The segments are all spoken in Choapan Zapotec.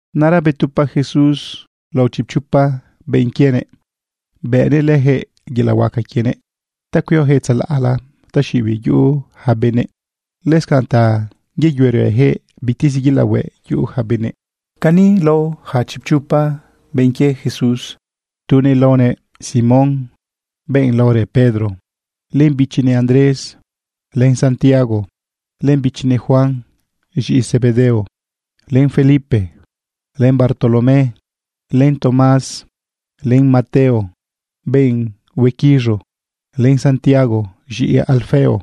Naꞌra betupa Jesús lao chipchopa benꞌ quienëꞌ. Bëꞌnëꞌ lëjëꞌ yelaꞌ huaca quienëꞌ ta cuiojëꞌ tzalaꞌla taxiꞌibiꞌ yuꞌu ja benëꞌ, lëscanꞌ ta yeyuerëjëꞌ bitezi yelaꞌ hueꞌ yuꞌu ja benëꞌ. Cani lao ja chipchopa benꞌ quie Jesús: tunëꞌ laonëꞌ Simón, benꞌ laorë Pedro, len bichinëꞌ Andrés, len Santiago, len bichinëꞌ Juan z̃iꞌi Zebedeo, len Felipe, len Bartolomé, len Tomás, len Mateo, benꞌ huequiz̃u, len Santiago, z̃iꞌi Alfeo,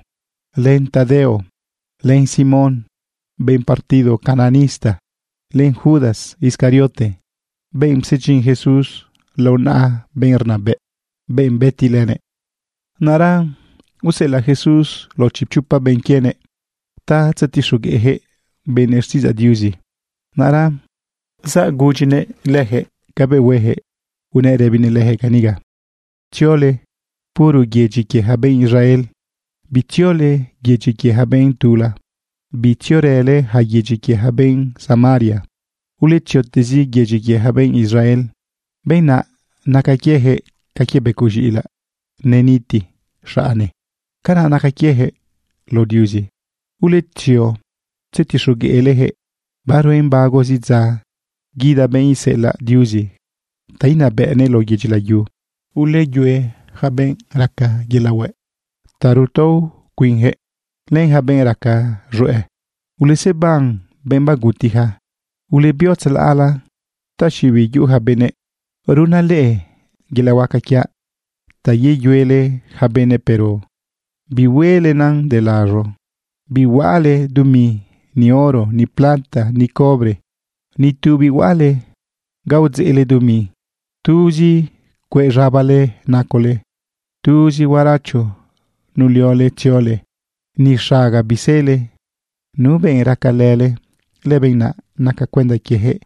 len Tadeo, len Simón, benꞌ partido cananista, len Judas Iscariote, benꞌ psedyin Jesús lao naꞌa benꞌ rnabëꞌ, benꞌ bëti lënëꞌ. Naꞌra useꞌelaꞌ Jesús lao chipchopa benꞌ quienëꞌ ta tzetixogueꞌjëꞌ benëꞌ xtiꞌidzaꞌ Diuzi. Naꞌra zagudyinëꞌ lëjëꞌ cabëꞌ huejëꞌ, unëꞌ rëbinëꞌ lëjëꞌ caniga: ―Tziole puro yedyi quie ja benꞌ Israel. Bitziole yedyi quie ja benꞌ tula. Bitziorële ja yedyi quie ja benꞌ Samaria. Uletziotezi yedyi quie ja benꞌ Israel. Benꞌ naꞌ naca quiejëꞌ ca quie becoꞌ z̃iꞌilaꞌ neniti xaꞌne. Canaꞌ naca quiejëꞌ lao Diuzi. Uletzio tzetixogueꞌlejëꞌ baruen bagozi dza guida benꞌ iseꞌelaꞌ Diuzi ta inabëꞌnëꞌ lao yedyi layu. Uleyue yaca benꞌ raca yelaꞌ hueꞌ ta rutao cuinjëꞌ len ja benꞌ raca z̃hueꞌ. Uleseban benꞌ bagutija. Ulebio tzalaꞌla taxiꞌibiꞌ yuꞌu ja benëꞌ. Runaꞌ leꞌe yelaꞌ huaca quiaꞌ ta yeyuele ja benëꞌ, pero bihuelenan de laz̃o. ’Bihuaꞌale dumi, ni oro, ni plata, ni cobre. Ni tu bihuaꞌale ga udzeꞌle dumi. Tuzi cueꞌ z̃abale nacole. Tuzi huaracho nuliole tziole. Ni xaga bisele. Nu benꞌ racalële, lëbenꞌ naꞌ naca cuenda quiejëꞌ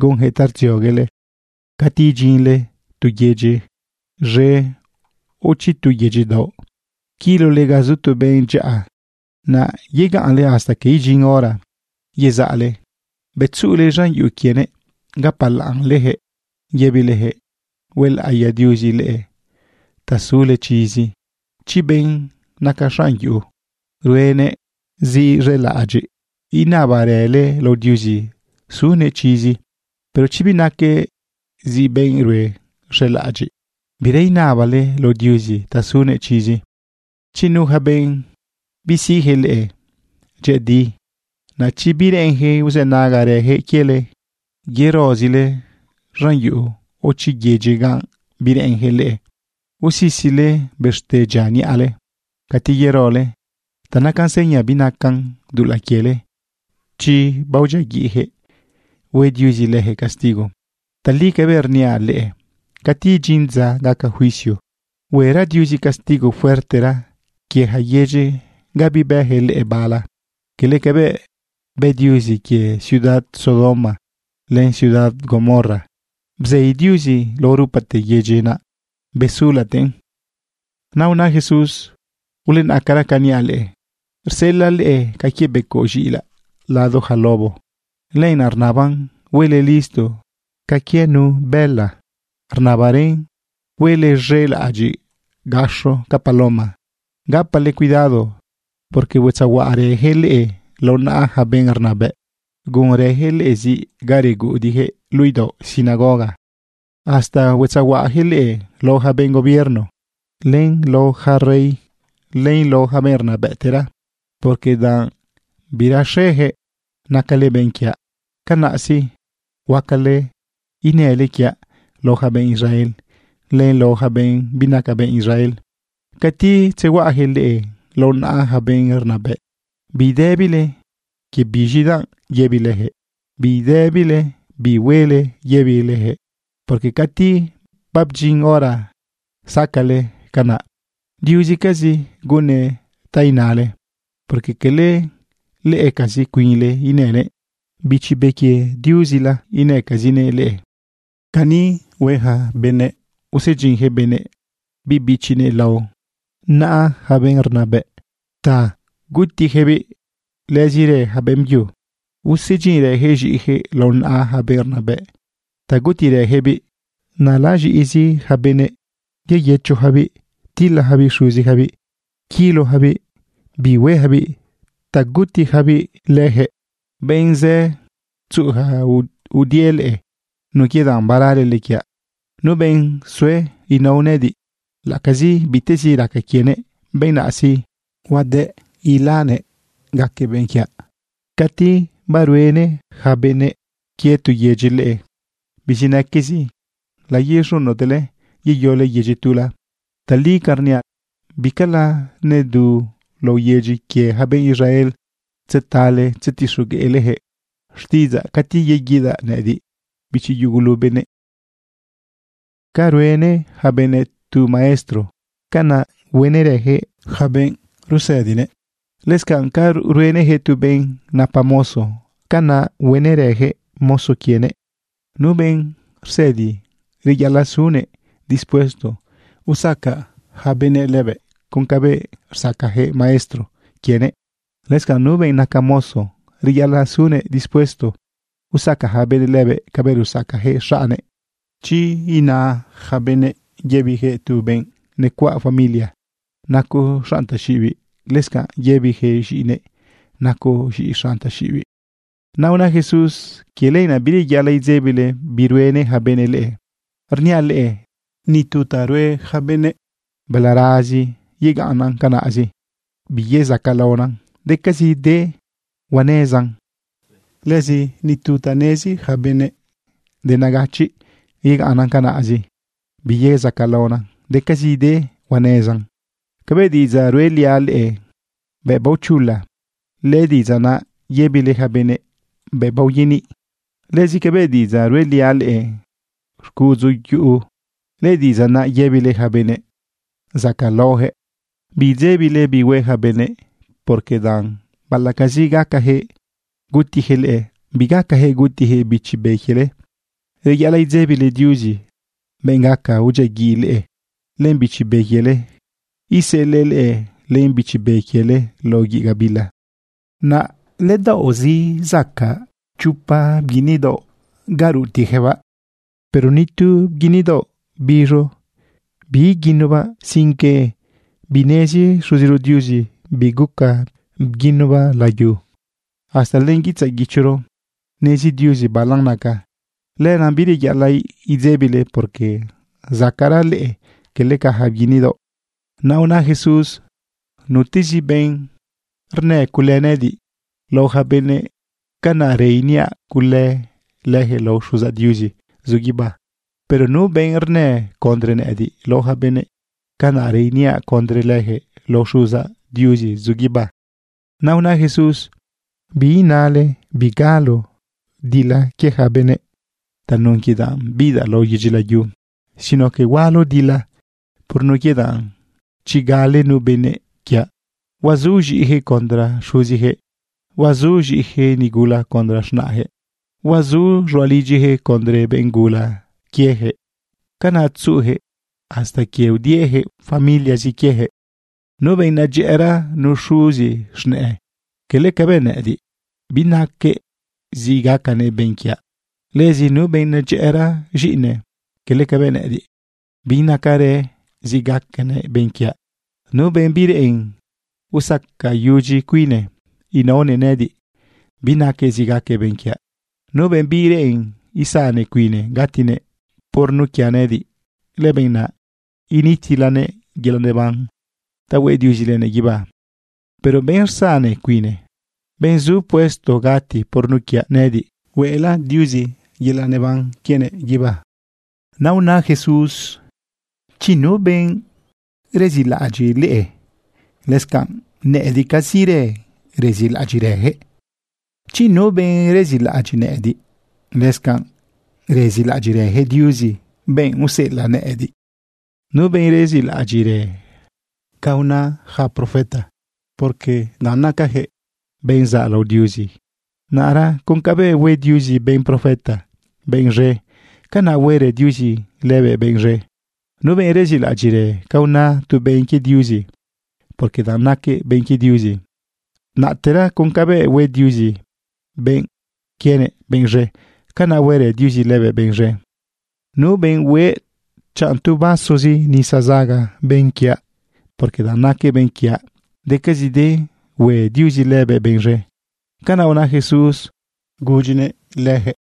gunjëꞌ ta rdzioguele. ’Cati idyinle tu yedyi z̃e o chi tu yedyi daoꞌ, quilole ga zu tu benꞌ dyaꞌa. Naꞌ yegaꞌnle hasta que idyin hora yezaꞌle. Bëꞌ tzuꞌule z̃an yuꞌu quienëꞌ, gapalaꞌnlejëꞌ yëbilejëꞌ: “Huelaꞌiya Diuzi leꞌe ta sule chizi.” Chi benꞌ naca xaꞌn yuꞌu ruenëꞌ zi z̃elaꞌadyiꞌ, inabarale lao Diuzi sunëꞌ chizi. Pero chi binaquëꞌ zi benꞌ rue z̃elaꞌadyiꞌ, bira inabale lao Diuzi ta sunëꞌ chizi. Chi nu ja benꞌ bisiꞌjëꞌ leꞌe dyëꞌëdi, naꞌ chi bireꞌenjëꞌ uzënagarëjëꞌ quiele, yerozile z̃an yuꞌu o chi yedyi ga bireꞌenjëꞌ leꞌe. Usisile bëxte dyia niꞌale cati yerole ta nacan seña binacan dulaꞌ quiele chi baodyiaguiꞌjëꞌ hue Diuzi lëjëꞌ castigo. Tali cabëꞌ rniaꞌ leꞌe, cati idyin dza gaca juicio, huera Diuzi castigo fuertera quie ja yedyi ga bibejëꞌ leꞌe bala, quele cabëꞌ bë Diuzi quie ciudad Sodoma len ciudad Gomorra. Bzei Diuzi lao rupate yedyi naꞌ besulatëꞌn. Naꞌ una Jesús: ―Ulenaꞌcara ca niaꞌ leꞌe. Rseꞌelaꞌ leꞌe ca quie becoꞌ z̃iꞌilaꞌ lado ja lobo. Lenaꞌ rnaban huele listo ca quie nu bëla. Rnabarën huele z̃elaꞌadyiꞌ gaxo ca paloma. Gapale cuidado, porque huetzehuaꞌarëjëꞌ leꞌe lao naꞌa ja benꞌ rnabëꞌ. Gunrëjëꞌ leꞌe ziꞌ ga reguꞌudiꞌjëꞌ luꞌu idaoꞌ sinagoga. Hasta huetzehuaꞌajëꞌ leꞌe lao ja benꞌ gobierno, len lao ja rey, len lao ja benꞌ rnabëꞌtera, porque danꞌ biraxejëꞌ nacale benꞌ quiaꞌ. Canaꞌ sí, huacale inële quiaꞌ lao ja benꞌ Israel len lao ja benꞌ binaca benꞌ Israel. Cati tzehuaꞌajëꞌ leꞌe lao naꞌa ja benꞌ rnabëꞌ, bidëbile quie biz̃idanꞌ yëbilejëꞌ, bidëbile bi huele yëbilejëꞌ. Porque cati babdyin hora sacaꞌle canaꞌ, Diuzcazi gunnëꞌ ta inale. Porque quele leꞌecazi cuinle inële, Bichi Be quie Diuzila, inëcazinëꞌ leꞌe. ’Cani hue yaca benëꞌ, usedyinjëꞌ benëꞌ biꞌ bichinëꞌ lao naꞌa ja benꞌ rnabëꞌ ta gutijëꞌbiꞌ. Lëzirë ja beꞌmbyu usedyinrëjëꞌ z̃iꞌijëꞌ lao naꞌa ja benꞌ rnabëꞌ ta gutirëjëꞌbiꞌ. Naꞌ laz̃iꞌizi ja benëꞌ yeyëchojabiꞌ tilajabiꞌ xuzijabiꞌ, quilojabiꞌ bihuejabiꞌ ta gutiyacabiꞌ lëjëꞌ. Benꞌ zë tzuꞌuja udie leꞌe nun quie danꞌ baralele quiaꞌ. Nu benꞌ sue inao nëꞌëdiꞌ laꞌacazi bitezi raca quienëꞌ, benꞌ naꞌ sí, huade ilanëꞌ gaquëꞌ benꞌ quiaꞌ. Cati baruenë ja benëꞌ quie tu yedyi leꞌe bizinaquezi, layez̃unotele yeyole yedyi tula. Tali ca rniaꞌ, bicala nedu lao yedyi quie ja benꞌ Israel tzetale tzetixogueꞌlejëꞌ xtiꞌidzaꞌ cati yeguidaꞌ nëꞌëdiꞌ, bichi yugulu benëꞌ. ’Ca ruenë ja benëꞌ tu maestro, canaꞌ huenërëjëꞌ yaca benꞌ rusëdinëꞌ. Lëscanꞌ ca ruenëjëꞌ tu benꞌ napa mozo, canaꞌ huenërëjëꞌ mozo quienëꞌ. Nu benꞌ rsëdi, reyaꞌalaꞌ sunëꞌ dispuesto usaca yaca benëꞌ lëbëꞌ con cabëꞌ rsacajëꞌ maestro quienëꞌ. Lëscanꞌ nu benꞌ naca mozo, reyaꞌalaꞌ sunëꞌ dispuesto usaca ja benëꞌ lëbëꞌ cabëꞌ rusacajëꞌ xaꞌnnëꞌ. Chi ina yaca benëꞌ yëbijëꞌ tu benꞌ necuaꞌ familia: “Nacoꞌ xanꞌ taxiꞌibiꞌ”, lëscanꞌ yëbijëꞌ z̃iꞌinëꞌ: “Nacoꞌ z̃iꞌi xanꞌ taxiꞌibiꞌ.” Naꞌ una Jesús: ―Quie lenaꞌ bireyaꞌalaꞌ idzebile bi ruenë ja benëꞌ leꞌe. Rniaꞌ leꞌe ni tu ta rue yaca benëꞌ balarazi yegaꞌnnan canaꞌzi biyezacaꞌlaona, decazi de huanezan. Lëzi ni tu ta nezi yaca benëꞌ de negachiꞌ yegaꞌnnan canaꞌzi biyezacaꞌlaona, decazide huanezan. Cabëꞌ diꞌidzaꞌ ruꞌeliaꞌ leꞌe bëꞌ baochula, lëdiꞌidzaꞌ naꞌ yëbile ja benëꞌ bëꞌ baoyaniꞌ. Lëzi cabëꞌ diꞌidzaꞌ ruꞌeliaꞌ leꞌe xcuꞌudzu yuꞌu, lëdiꞌidzaꞌ naꞌ yëbile ja benëꞌ zacaꞌlaojëꞌ. Bidzebile bi hue ja benëꞌ, porque danꞌ baꞌalaꞌcazi gacajëꞌ gutijëꞌ leꞌe, bigacajëꞌ gutijëꞌ bichi be quiele. Reyaꞌalaꞌ idzebile Diuzi, benꞌ gaca udyiaguiꞌ leꞌe len bichi be quiele iseꞌelëꞌ leꞌe len bichi be quiele lao guiꞌ gabila. ’Naꞌ ledaoꞌzi zacaꞌ chopa bguini daoꞌ ga rutiꞌjëꞌbaꞌ, pero ni tu bguini daoꞌ biz̃u biiguinubaꞌ sino que binezi Xuziro Diuzi biguca bguinubaꞌ layu. Hasta len guitzaꞌ guichoro nezi Diuzi balan naca. Lenaꞌ bireyaꞌalaꞌ idzebile, porque zacaꞌra leꞌe quele ca ja bguini daoꞌ. Naꞌ una Jesús: ―Nutezi benꞌ rnë cule nëꞌëdiꞌ lao ja benëꞌ, canaꞌrë iniaꞌ cule lëjëꞌ lao Xuzaꞌ Diuzi zu guibá. Pero nu benꞌ rnë condre nëꞌëdiꞌ lao ja benëꞌ, canaꞌrë iniaꞌ condre lëjëꞌ lao Xuzaꞌ Diuzi zu guibá. Naꞌ una Jesús: ―Biinale bigalo dila quie ja benëꞌ tanun quie danꞌ bidaꞌ lao yedyi layu, sino que hualo dila. Por nun quie danꞌ chi gale nu benëꞌ quiaꞌ, huazu z̃iꞌijëꞌ condre xuzijëꞌ, huazu z̃iꞌijëꞌ nigula condre z̃naꞌjëꞌ, huazu z̃ualidyijëꞌ condre benꞌ gula quiejëꞌ. Canaꞌ tzuꞌujëꞌ hasta quie udiejëꞌ familiazi quiejëꞌ. ’Nu benꞌ nedyëꞌëra nu xuzi z̃nëꞌë quele cabëꞌ nëꞌëdiꞌ, binaquëꞌ zi gacanëꞌ benꞌ quiaꞌ. Lëzi nu benꞌ nedyëꞌëra z̃iꞌine, quele cabëꞌ nëꞌëdiꞌ, binacarëꞌ zi gacanëꞌ benꞌ quiaꞌ. Nu benꞌ bireꞌen usacayudyi cuinnëꞌ inaonëꞌ nëꞌëdiꞌ, binaquëꞌ zi gaquëꞌ benꞌ quiaꞌ. Nu benꞌ bireꞌen izane cuine gatinëꞌ por nun quiaꞌ nëꞌëdiꞌ, lëbenꞌ naꞌ initilanëꞌ yelaꞌ neban ta hueꞌ Diuzi lënëꞌ guibá. Pero benꞌ rzane cuine, benꞌ zu puesto gati por nun quiaꞌ nëꞌëdiꞌ, hueꞌla Diuzi yelaꞌ neban quienëꞌ guibá. Naꞌ una Jesús: ―Chi nu benꞌ rezilaꞌadyiꞌ leꞌe, lëscanꞌ nëꞌëdiꞌcazirë rezilaꞌadyiꞌrëjëꞌ. Chi nu benꞌ rezilaꞌadyiꞌ nëꞌëdiꞌ, lëscanꞌ rezilaꞌadyiꞌrëjëꞌ Diuzi, benꞌ useꞌelaꞌ nëꞌëdiꞌ. Nu benꞌ rezilaꞌadyiꞌrë ca una yaca profeta, porque danꞌ nacayaquëꞌ benꞌ zaꞌlao Diuzi, naꞌra con cabëꞌ hue Diuzi benꞌ profeta benꞌ z̃e, canaꞌ huerë Diuzi lëbëꞌ benꞌ z̃e. Nu benꞌ rezilaꞌadyiꞌrë ca una tu benꞌ quie Diuzi, porque danꞌ naquëꞌ benꞌ quie Diuzi, naꞌtera con cabëꞌ hue Diuzi benꞌ quienëꞌ benꞌ z̃e, canaꞌ huerë Diuzi lëbëꞌ benꞌ z̃e. Nu benꞌ hueꞌ chanꞌ tu vasozi nisa zaga benꞌ quiaꞌ, porque danꞌ naquëꞌ benꞌ quiaꞌ, decazide hue Diuzi lëbëꞌ benꞌ z̃e. ―Canaꞌ una Jesús gudyinëꞌ leyaquëꞌ.